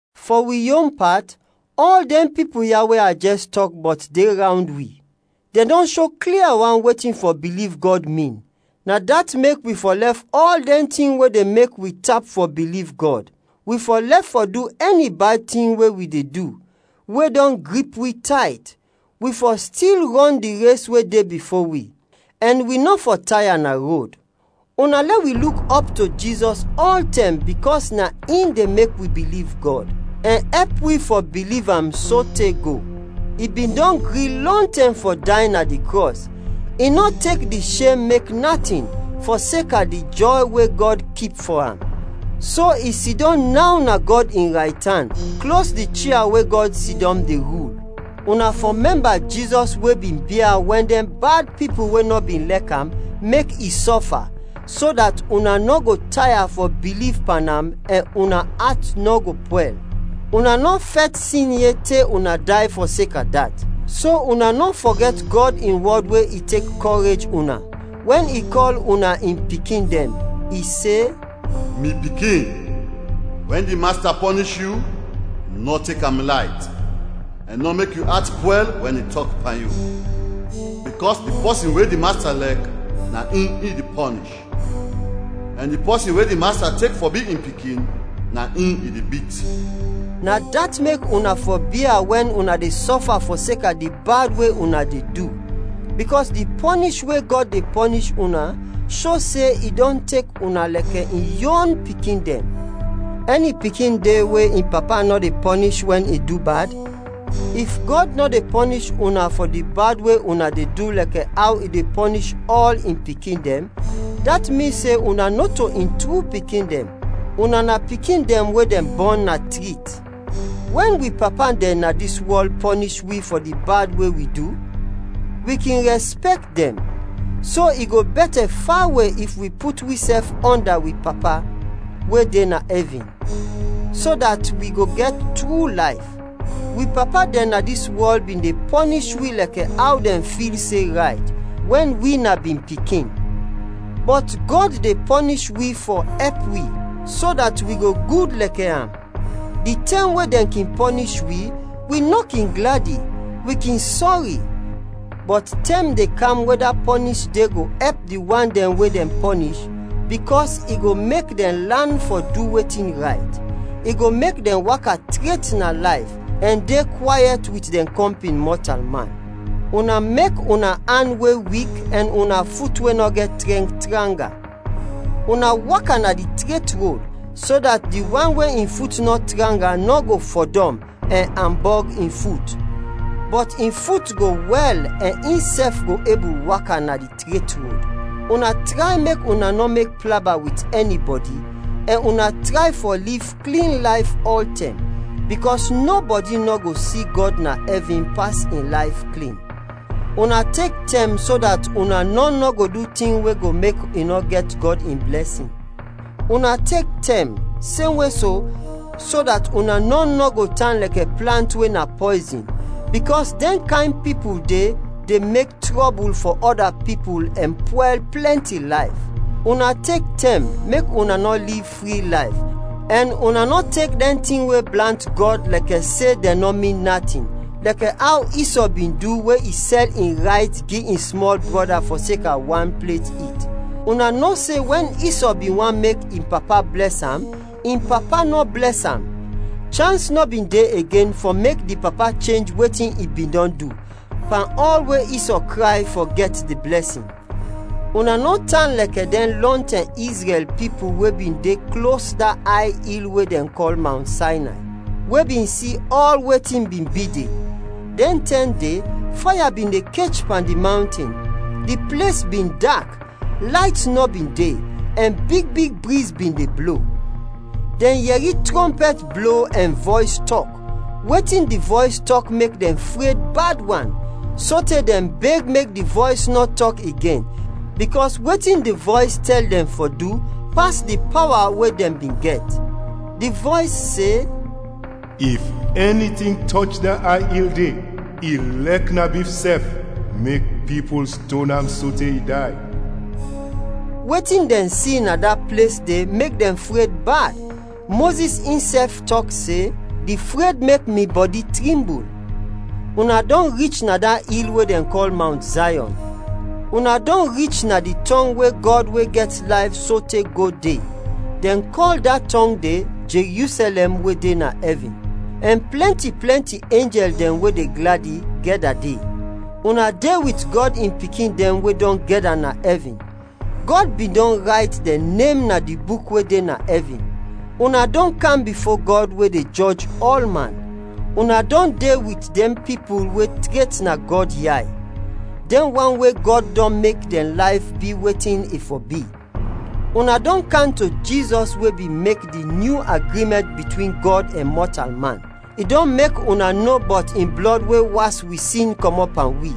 Fɔ wi yon pat, ɔl dɛn pipul ya we a jɛs tɔk bɔt de rawnd wi. Dɛn dɔn sho klia wan wetin fɔ biliv Gɔd, min. Na dat mek wi fɔ lɛf ɔl dɛn tin we de mek wi tap fɔ biliv Gɔd; wi fɔ lɛf fɔ du ɛni bad tin we wi de du, we dɔn grip wi tayt; wi fɔ stil rɔn di res we de bifo wi, ɛn wi nɔ fɔ taya na rod. Una lɛ wi luk ɔp to Jizɔs ɔltɛm bikɔs na in de mek wi biliv Gɔd, ɛn ɛp wi fɔ biliv am sote go. I bin dɔn gri lɔntɛm fɔ day na di krɔs, i nɔ tek di shem mek natin, fɔseka di jɔy we Gɔd kip fɔ am. So, i sidɔm naw na Gɔd in raytan, klos di chia we Gɔd sidɔm de rul. Una fɔ mɛmba Jizɔs we bin bia wɛn dɛn bad pipul we nɔ bin lɛk am, mek i sɔfa, so dat una nɔ go taya fɔ biliv pan am ɛn una at nɔ go pwɛl. Una nɔ fɛt sin yet te una day fɔseka dat. So una nɔ fɔgɛt Gɔd in wɔd we i tek kɔrej una, wɛn i kɔl una in pikin dɛn. I se, “Mi pikin, wɛn di Masta pɔnish yu, nɔ tek am layt, ɛn nɔ mek yu at pwɛl wɛn i tɔk pan yu. Bikɔs di pɔsin we di Masta lɛk, na in i de pɔnish, ɛn di pɔsin we di Masta tek fɔ bi in pikin, na in i de bit.” Na dat mek una fɔ bia wɛn una de sɔfa fɔseka di bad we una de du, bikɔs di pɔnish we Gɔd de pɔnish una sho se i dɔn tek una lɛkɛ in yon pikin dɛn. Ɛni pikin de we in papa nɔ de pɔnish wɛn i du bad? If Gɔd nɔ de pɔnish una fɔ di bad we una de du lɛkɛ aw i de pɔnish ɔl in pikin dɛn, dat min se una nɔto in tru pikin dɛn, una na pikin dɛn we dɛn bɔn na trit. Wɛn wi papa dɛn na dis wɔl pɔnish wi fɔ di bad we wi du, wi kin rɛspɛkt dɛn. So i go bɛtɛ fawe if wi put wisɛf ɔnda wi Papa we de na ɛvin, so dat wi go gɛt tru layf. Wi papa dɛn na dis wɔl bin de pɔnish wi lɛkɛ aw dɛn fil se rayt, wɛn wi na bin pikin. Bɔt Gɔd de pɔnish wi fɔ ɛp wi, so dat wi go gud lɛkɛ am. Di tɛm we dɛn kin pɔnish wi, wi nɔ kin gladi, wi kin sɔri. Bɔt tɛm de kam we da pɔnish de go ɛp di wan dɛn we dɛn pɔnish, bikɔs i go mek dɛn lan fɔ du wetin rayt. I go mek dɛn waka tret na layf ɛn de kwayɛt wit dɛn kɔmpin mɔtalman. Una mek una an we wik ɛn una fut we nɔ gɛt trɛnk, tranga. Una waka na di tret rod, so dat di wan we in fut nɔ tranga nɔ go fɔdɔm ɛn ambɔg in fut, bɔt in fut go wɛl ɛn insɛf go ebul waka na di tret rod. Una tray mek una nɔ mek plaba wit ɛnibɔdi, ɛn una tray fɔ liv klin layf ɔltɛm, bikɔs nɔbɔdi nɔ go si Gɔd na ɛvin pas in layf klin. Una tek tɛm so dat una nɔn nɔ go du tin we go mek i nɔ gɛt Gɔd in blɛsin. Una tek tɛm, semwe so, so dat una nɔn nɔ go tan lɛkɛ plant we na pɔyzin, bikɔs dɛn kayn pipul de de mek trɔbul fɔ ɔda pipul ɛn pwɛl plɛnti layf. Una tek tɛm, mek una nɔ liv fri layf, ɛn una nɔ tek dɛn tin we blant Gɔd lɛkɛ se dɛn nɔ min natin, lɛkɛ aw Isɔ bin du we i sɛl in rayt gi in smɔl brɔda fɔseka wan plet it. Una no se wɛn Isɔ bin want mek in papa blɛs am, in papa nɔ blɛs am. Chans nɔ bin de igen fɔ mek di papa chenj wetin i bin dɔn du, pan ɔl we Isɔ kray fɔ gɛt di blɛsin. Una nɔ tan lɛkɛ dɛn lɔntɛm Izrɛl pipul we bin de klos da ay il we dɛn kɔl Mawnt Saynay, we bin si ɔl wetin bin bi de. Dɛn tɛm de, faya bin de kech pan di mawnten, di ples bin dak, layt nɔ bin de, ɛn big big briz bin de blo. Dɛn yɛri trɔmpɛt blo ɛn vɔys tɔk. Wetin di vɔys tɔk mek dɛn fred bad wan, sote dɛn beg mek di vɔys nɔ tɔk igen, bikɔs wetin di vɔys tɛl dɛn fɔ du pas di pawa we dɛn bin gɛt. Di vɔys se, “If ɛni tin tɔch da ay il de, ilɛk na bif sɛf, mek pipul ston am sote i day.” Wetin dɛn si na da ples de mek dɛn fred bad. Mozis insɛf tɔk se, “Di fred mek mi bɔdi trimbul.” Una dɔn rich na da il we dɛn kɔl Mawnt Zayɔn. Una dɔn rich na di tɔng we Gɔd we gɛt layf sote go, de; dɛn kɔl da tɔng de “Jerusɛlɛm we de na ɛvin,” ɛn plɛnti plɛnti enjɛl dɛn we de gladi, gɛda de. Una de wit Gɔd in pikin dɛn we dɔn gɛda na ɛvin. Gɔd bin dɔn rayt dɛn nem na di buk we de na ɛvin. Una dɔn kam bifo Gɔd we de jɔj ɔlman. Una dɔn de wit dɛn pipul we tret na Gɔd yay, dɛn wan we Gɔd dɔn mek dɛn layf bi wetin i fɔ bi. Una dɔn kam to Jizɔs we bin mek di nyu agrimɛnt bitwin Gɔd ɛn mɔtalman. I dɔn mek una no bɔt in blɔd we was wi sin kɔmɔt pan wi.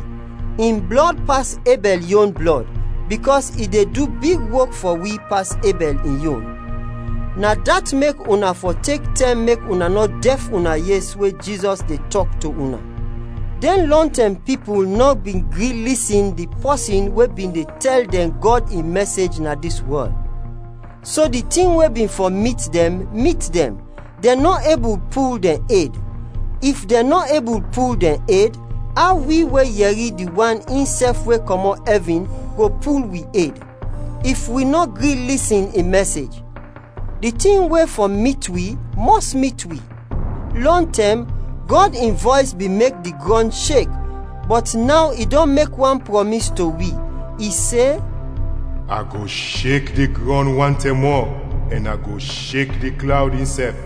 In blɔd pas Ebɛl yon blɔd, bikɔs i de du big wok fɔ wi pas Ebɛl in yon. Na dat mek una fɔ tek tɛm mek una nɔ dɛf una yes we Jizɔs de tɔk to una. Dɛn lɔntɛm pipul nɔ bin gri lisin di pɔsin we bin de tɛl dɛn Gɔd in mɛsej na dis wɔl, so di tin we bin fɔ mit dɛn, mit dɛn, dɛn nɔ ebul pul dɛn ed. If dɛn nɔ ebul pul dɛn ed, aw wi we yɛri di wan insɛf we kɔmɔt ɛvin go pul wi ed, if wi nɔ gri lisin in mɛsej? Di tin we fɔ mit wi mɔs mit wi. Lɔntɛm, Gɔd in vɔys bin mek di grɔn shek, bɔt naw i dɔn mek wan prɔmis to wi. I se, “A go shek di grɔn wan tɛm mɔ, ɛn a go shek di klawd insɛf.”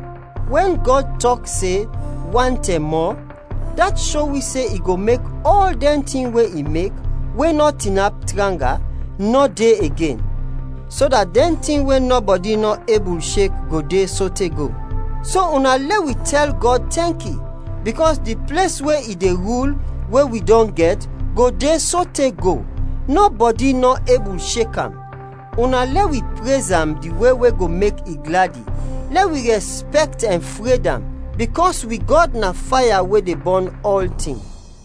Wɛn Gɔd tɔk se, “wan tɛm mɔ,” dat sho wi se i go mek ɔl dɛn tin we i mek, we nɔ tinap tranga, nɔ de igen, so dat dɛn tin we nɔbɔdi nɔ ebul shek go de sote go. So, una lɛ wi tɛl Gɔd tɛnki, bikɔs di ples we i de rul we wi dɔn gɛt, go de sote go, nɔbɔdi nɔ ebul shek am. Una lɛ wi prez am di we we go mek i gladi, lɛ wi rɛspɛkt ɛn fred am, bikɔs wi Gɔd na faya we de bɔn ɔltin.